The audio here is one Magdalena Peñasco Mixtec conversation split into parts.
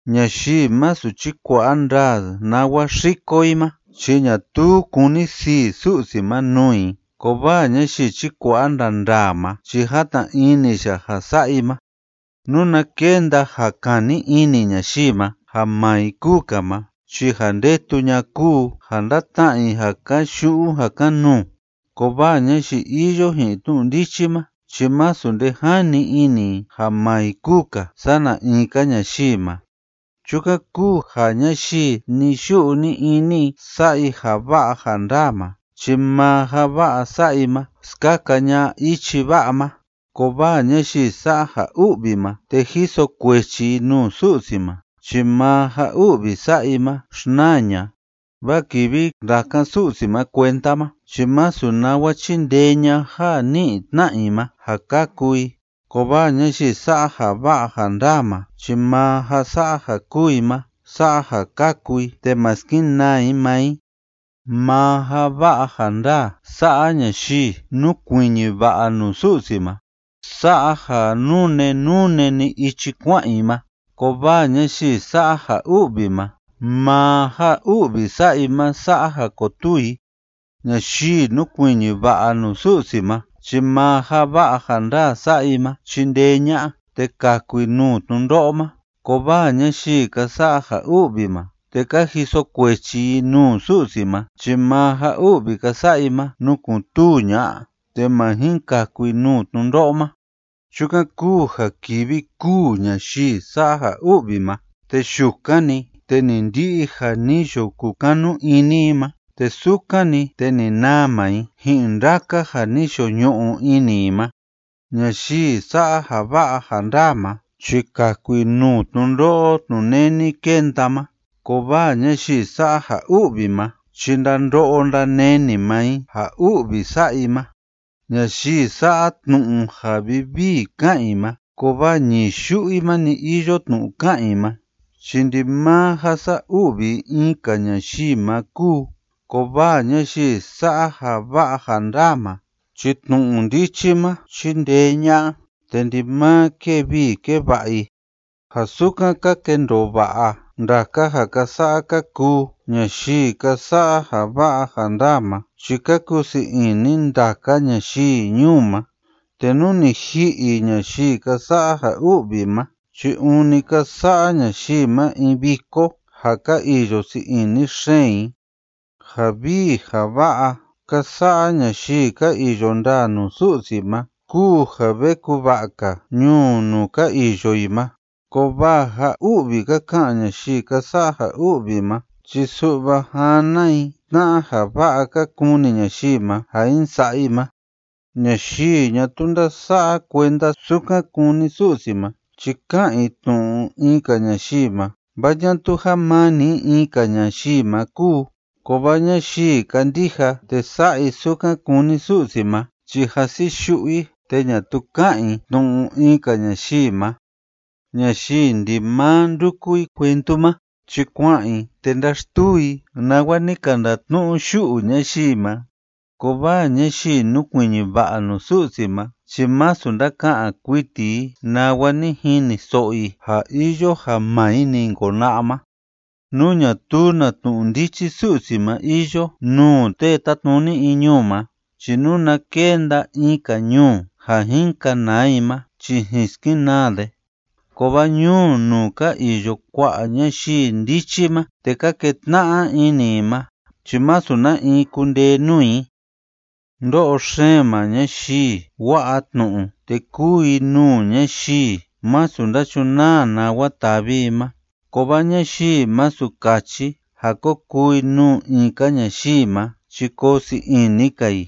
Ñayii masu chíkua'a ndaa nawa xíko i ma chi ñatuu kúni sii Su'si ma nuu i, kovaa ñayii chíkua'a ndaa ndaa ma chi játna ini ya ja sa'a i ma. Nuna kenda ja kani ini ñayii ma ja maa i kúu‑ka ma chi ja ndetu ña'a kúu ja ndatna'a i ja kayu'u ja kan‑nuu, kovaa ñayii iyo ji'in tnu'u ndichi ma chi masu nde jani ini i ja maa i kúu‑ka sana in‑ka ñayii ma. Chukan kúu ja ñayii ni‑yu'u ni‑ini i sa'a i ja va'a ja ndaa ma chi maa ja va'a sa'a i ma skaka ña'a ichi va'a ma, kovaa ñayii sa'a ja u'vi ma te jiso kuechi i nuu Su'si ma chi maa ja u'vi sa'a i ma xnaa ña'a. Vaa kivi ndakan Su'si ma kuenda ma chi masu nawa chindee ña'a ja ni'i tna'a i ma ja kaku i, kovaa ñayii sa'a ja va'a ja ndaa ma chi maa ja sa'a ja kúu i ma sa'a ja kaku i te ma skenaa i maa i. Maa ja va'a ja ndaa sa'a ñayii núkuiñi va'a nuu Su'si ma sa'a ja nune nune‑ni ichi kua'an i ma, kovaa ñayii sa'a ja u'vi ma, maa ja u'vi sa'a i ma sa'a ja kotuu i. Ñayii núkuiñi va'a nuu Su'si ma chi maa ja va'a ja ndaa sa'a i ma chindee ña'a te kaku i nuu tnundo'o ma, kovaa ñayii ka sa'a ja u'vi ma te ka jiso kuechi i nuu Su'si ma chi maa ja u'vi ka sa'a i ma nukun‑tuu ña'a te ma jin kaku i nuu tnundo'o ma. Chukan kúu ja kivi kûu ñayii sa'a ja u'vi ma, te yukan‑ni, te ni ndi'i ja ni yo kukanu ini i ma, te sukan‑ni, te ni naa maa i ji'in ndaka ja ni yo ñu'u ini i ma. Ñayii sa'a ja va'a ja ndaa ma chi kaku i nuu tnundo'o tnuneni kenda ma, kovaa ñayii sa'a ja u'vi ma chi ndando'o ndaneni maa i ja u'vi sa'a i ma. Ñayii sa'a tnu'u ja vivii ká'an i ma kovaa ñii yu'u i ma‑ni iyo tnu'u ká'an i ma, chi ndimaa ja sa'a u'vi i in‑ka ñayii ma kúu. Kovaa ñayii sa'a ja va'a ja ndaa ma chi tnu'u ndichi ma chíndee ña'a te ndimaa kée vii kée va'a i. Ja sukan ka kendoo va'a ndaka ja ka sa'a ka kuu ñayii ka sa'a ja va'a ja ndaa ma chi ka kuu sii ini ndaka ñayii ñuu ma. te nú ni ji'i ñayii ka sa'a ja u'vi ma chi ûni ka sa'a ñayii ma in viko ja ka iyo sii ini xeen i. Ja vii ja va'a ka sa'a ñayii ka iyo ndaa nuu Su'si ma kúu ja ve kuva'a‑ka ñuu nuu ka iyo i ma, kovaa ja u'vi ka ka'an ñayii ka sa'a ja u'vi ma chi su'va jana i tna'a ja va'a ka kuni ñayii ma ja jin sa'a i ma. Ñayii ñatuu ndása'a kuenda sukan kúni Su'si ma chi ká'an i tnu'u in‑ka ñayii ma, vaa ñatuu jamani i in‑ka ñayii ma kúu, kovaa ñayii kándija te sa'a i sukan kúni Su'si ma chi jasi yu'u i te ñatuu ká'an i tnu'u in‑ka ñayii ma. Ñayii ndimaa ndúku i cuentu ma chi kua'an i te ndáxtuu i nawa ni ka ndatnu'u yu'u ñayii ma, kovaa ñayii núkuiñi va'a nuu Su'si ma chi masu ndáka'an kuiti i nawa ni jiniso'o i ja iyo ja maa i‑ni jin kona'a ma. Nú ñatuu na tnu'u ndichi Su'si ma iyo nuu tee tátnuni in ñuu ma chi nuna kenda in‑ka ñuu ja jin kanaa i ma chi jin skenaa de, kovaa ñuu nuu ka iyo kua'a ñayii ndichi ma te ka ketna'a ini i ma chi masu na in kundee nuu i. Ndo'o xeen maa ñayii wa'a tnu'u te kúu i nuu ñayii masu ndachunaa nawa tavi i ma, kovaa ñayii masu kachi ja ko kuu i nuu in‑ka ñayii ma chi koo sii ini‑ka i.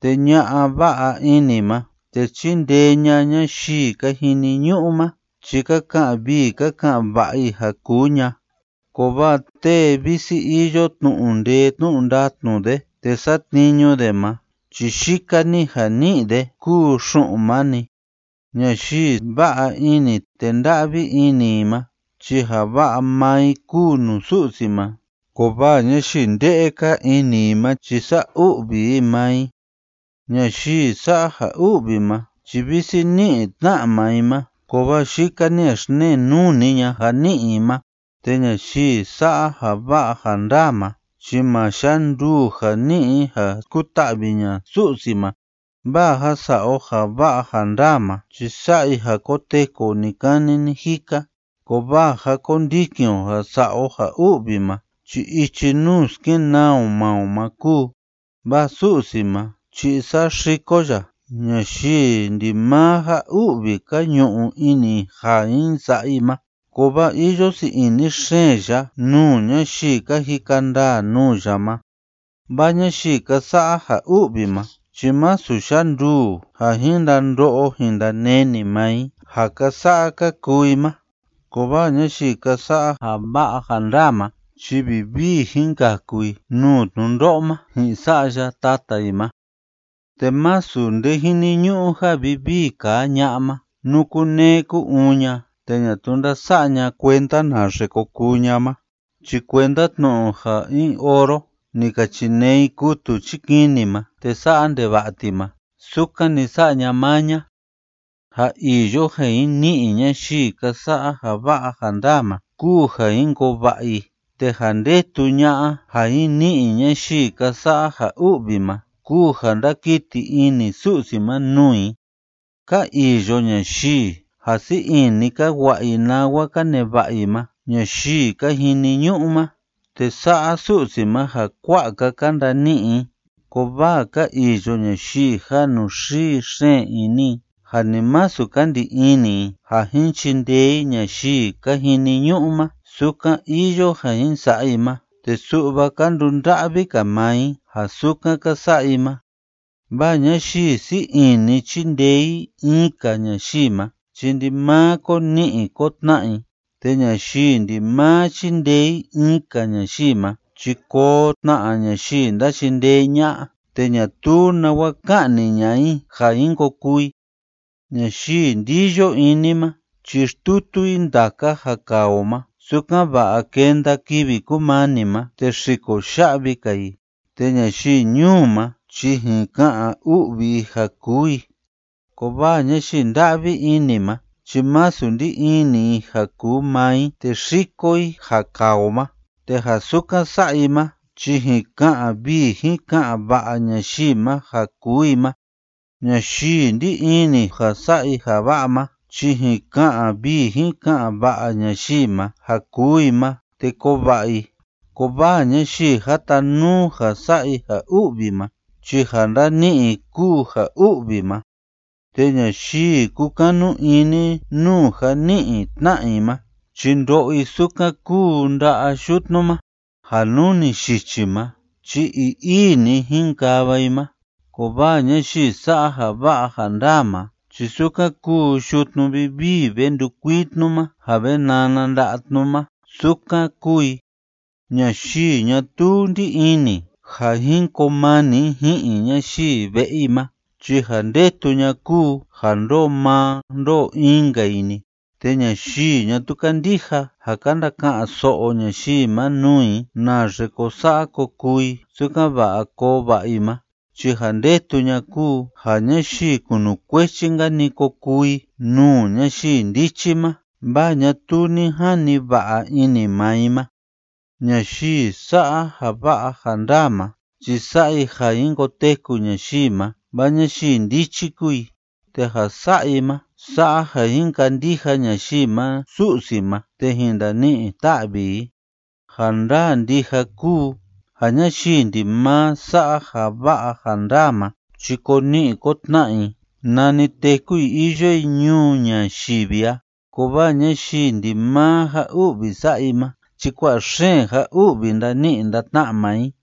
Te ña'a va'a ini ma, te chíndee ña ñayii ka jiniñu'u ma chi ka ka'an vii ka ka'an va'a i ja kuu ña, kovaa tee visi iyo tnu'u ndee tnu'u ndatnu de te satniñu de ma chi yika‑ni ja ni'i de kúu xu'un ma‑ni. Ñayii va'a ini te nda'vi ini i ma chi ja va'a maa i kúu nuu Su'si ma, kovaa ñayii ndee kaa ini i ma chi sa'a u'vi i maa i. Ñayii sa'a ja u'vi ma chi visi ní'i tna'a maa i ma, kovaa yika‑ni ja xnee nuu‑ni ña'a ja ní'i i ma. Te ñayii sa'a ja va'a ja ndaa ma chi ma yanduu ja ni'i i ja skuta'vi ña'a Su'si ma. Vaa ja sa'a o ja va'a ja ndaa ma chi sa'a i ja koteku o ni‑kani ni‑jika, kovaa ja kondikin o ja sa'a o ja u'vi ma chi ichi nuu skenaa o maa o ma kúu. Vaa Su'si ma chi saxiko ya ñayii ndimaa ja u'vi ka ñu'u ini i ja jin sa'a i ma, kovaa iyo sii ini xeen ya nuu ñayii ka jika ndaa nuu ya ma. Vaa ñayii ka sa'a ja u'vi ma chi masu yanduu ja jin ndando'o jin ndaneni maa i ja ka sa'a ka kuu i ma, kovaa ñayii ka sa'a ja va'a ja ndaa ma chi vivii jin kaku i nuu tnundo'o ma ji'in sa'ya tata i ma. Te masu nde jiniñu'u ja vivii kaa ña'a ma, nú kunee ku‑uun ña te ñatuu ndása'a ña kuenda naxe ko kuu ña ma, chi kuenda tnu'u ja in oro ni ka chinee i kutu chikini ma te sa'a ndeva'a ti ma, sukan‑ni sa'a ña maa ña. Ja iyo ja jin ni'i ñayii ka sa'a ja va'a ja ndaa ma kúu ja jin koo va'a i, te ja ndetu ña'a ja jin ni'i ñayii ka sa'a ja u'vi ma kúu ja ndakiti ini Su'si ma nuu i. Ka iyo ñayii ja sii ini ka wa'a i nawa ka neva'a i ma ñayii ka jiniñu'u ma, te sa'a Su'si ma ja kua'a‑ka ka ndani'i i, kovaa ka iyo ñayii ja inuxii xeen ini i ja ni masu ka ndi ini i ja jin chindee i ñayii ka jiniñu'u ma sukan iyo ja jin sa'a i ma, te su'va ka ndunda'vi‑ka maa i ja sukan ka sa'a i ma. Vaa ñayii sii ini chíndee i in‑ka ñayii ma chi ndimaa ko ni'i ko tna'a i, te ñayii ndimaa chíndee i in‑ka ñayii ma chi koo tna ñayii ndachindee ña'a te ñatuu nawa ka'ni ña'a i ja jin ko kuu i. Ñayii ndiyo ini ma chi xtutu i ndaka ja kaa o ma, sukan‑va'a kenda kivi kumani ma te xiko ya'vi‑ka i, te ñayii ñuu ma chi jin ka'an u'vi i ja kuu i, kovaa ñayii nda'vi ini ma chi masu ndí ini i ja kuu maa i te xíko i ja kaa o ma, te ja sukan sa'a i ma chi jin ka'an vii jin ka'an va'a ñayii ma ja kuu i ma. Ñayii ndí ini ja sa'a i ja va'a ma chi jin ka'an vii jin ka'an va'a ñayii ma ja kuu i ma te koo va'a i, kovaa ñayii jatanuu ja sa'a i ja u'vi ma chi ja ndani'i i kúu ja u'vi ma. Te ñayii kúkanu ini nuu ja ní'i tna'a i ma chi ndo'o i sukan kúu nda'a yutnu ma ja nú ni yichi ma chi ii‑ii‑ni jinkava i ma, kovaa ñayii sa'a ja va'a ja ndaa ma chi sukan kúu yutnu vivii ve ndukuii tnu ma ja ve nana nda'a tnu ma, sukan kúu i. Ñayii ñatuu ndí ini ja jin koo mani i ji'in ñayii ve'e i ma chi ja ndetu ña'a kúu ja ndoo maa ndoo in‑nka i‑ni, te ñayii ñatuu kándija ja ka ndaka'an so'o ñayii ma nuu i naxe ko sa'a ko kuu i sukan‑va'a koo va'a i ma, chi ja ndetu ña'a kúu ja ñayii kunukuechi‑nka‑ni ko kuu i nuu ñayii ndichi ma, vaa ñatuu ni jani va'a ini maa i ma. Ñayii sa'a ja va'a ja ndaa ma chi sa'a i ja jin koteku ñayii ma, vaa ñayii ndichi kúu i, te ja sa'a i ma sa'a ja jin kandija ñayii ma Su'si ma te jin ndani'i ta'vi i. Ja ndaa ndija kúu ja ñayii ndimaa sa'a ja va'a ja ndaa ma chi ko ni'i ko tna'a i nani téku i iyo i ñuu ñayivi a, kovaa ñayii ndimaa ja u'vi sa'a i ma chi kua'a xeen ja u'vi ndani'i ndatna'a maa i.